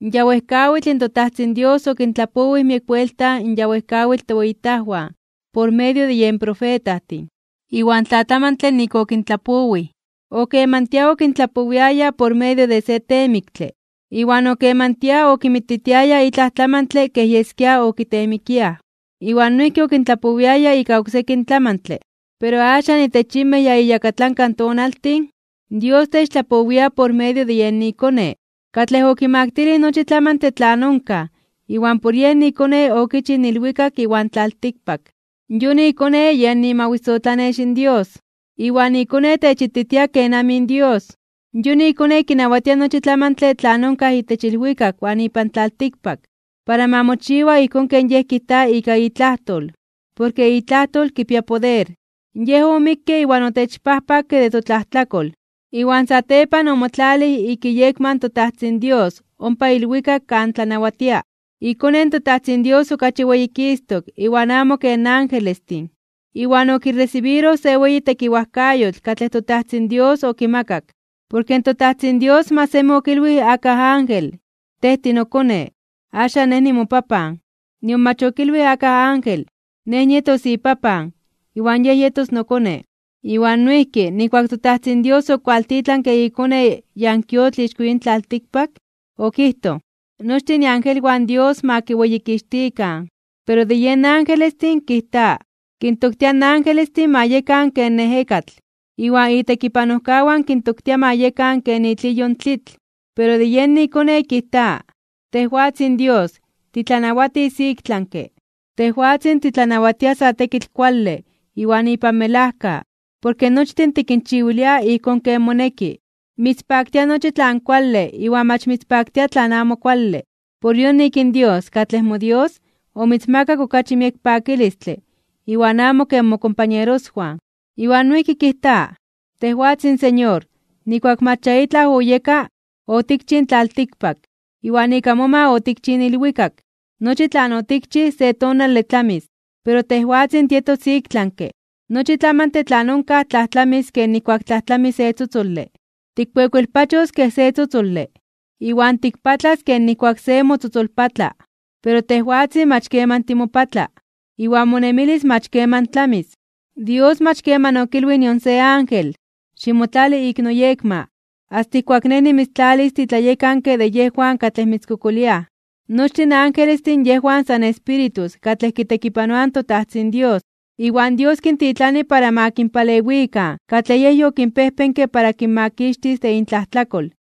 Ya wejkawitl in toTajtzin Dios okintlapowij miek buelta in ya wejkawitl toweyitajwan por medio de yen profetajtin. Iwan tlatlamantle nik okintlapowij. Okemantia okintlapowiaya por medio de se temiktle, iwan okemantia okinmititiaya itlaj tlamantle kej yeskia okiteemikiaj, iwan noijki okintlapowiaya ika oksekin tlamantle. Pero axan itech yinmej ya iyakatlanka tonaltin, Dios techtlapowia por medio de iKone, katlej okimaktilij nochi tlamantle tlan onkaj iwan por yen iKone okichij in ilwikak iwan tlaltikpak. Yon iKone yen imawisotlanex in Dios, iwan iKone techititia kenamij in Dios. Yon iKone kinawatia nochi tlamantle tlan onkaj itech ilwikak iwan ipan tlaltikpak para ma mochiwa ijkón ken Yej kijta ika itlajtol, porke itlajtol kipia poder. Yej omikke iwan otechpajpakke de totlajtlakol, iwan satepan omotlalij ik iyekma in toTajtzin Dios ompa ilwikak kan tlanawatia. IKone in toTajtzin Dios okachi weyikistok (weyititok) iwan amo ken angelestin, iwan okiresibiroj se weyi tekiwajkayotl katlej toTajtzin Dios okimakak. Porke toTajtzin Dios mach semi okilwij akaj ángel: Tej tinoKone. Axan Nej nimoPapan. Nion mach okilwij akaj ángel: Nej nietos iPapan, iwan yej yetos noKone. Iwan noijki, nijkuak in toTajtzin Dios okualtitlanke iKone yankuiotl ixko yin tlaltikpak, okijtoj: Nochtin iangelwan Dios ma kiweyikixtikan. Pero de yen angelestin, kijta: Kintoktia in angelestin ma yekan ken ejekatl, iwan itekipanojkawan kintoktia ma yekan ken itliyo in tlitl. Pero de yen iKone, kijta: Tejwatzin Dios, titlanawatis iktlanke (ik tlami). Tejwatzin titlanawatia sa tekitl kuale iwan ipan melajka, porke nochtin tikinchiwilia ijkón ken moneki. Mitzpaktia nochi tlan kuale iwan mach mitzpaktia tlan amo kuale. Por yonik in Dios, katlej moDios, omitzmakak okachi miek pakilistle iwan amo ken mokompañeroswan. Iwan noijki kijta: Tejwatzin Señor, nijkuak mach ya itlaj oyeka, otikchij in tlaltikpak, iwan ika moma otikchij in ilwikak. Nochi tlan otikchij se tonale tlamis, pero tejwatzin, tietos iktlanke (ik tlami). Nochi tlamantle tlan onkaj tlajtlamis ken nijkuak tlajtlami se tzotzole. Tikkuekuelpachos kej se tzotzole, iwan tikpatlas ken nijkuak se motzotzolpatla. Pero tejwatzin mach keman timopatla, iwan monemilis mach keman tlamis. Dios mach keman okilwij nion se ángel: Ximotlali ik noyekma, asta ijkuak Nej nimitztlalis titlayekanke de yejwan katlej mitzkokoliaj. Nochtin angelestin yejwan san espíritus katlej kitekipanoaj in toTajtzin Dios, iwan Dios kintitlani para ma kinpalewikan katlej Yej yokinpejpenke para kinmakixtis de intlajtlakol.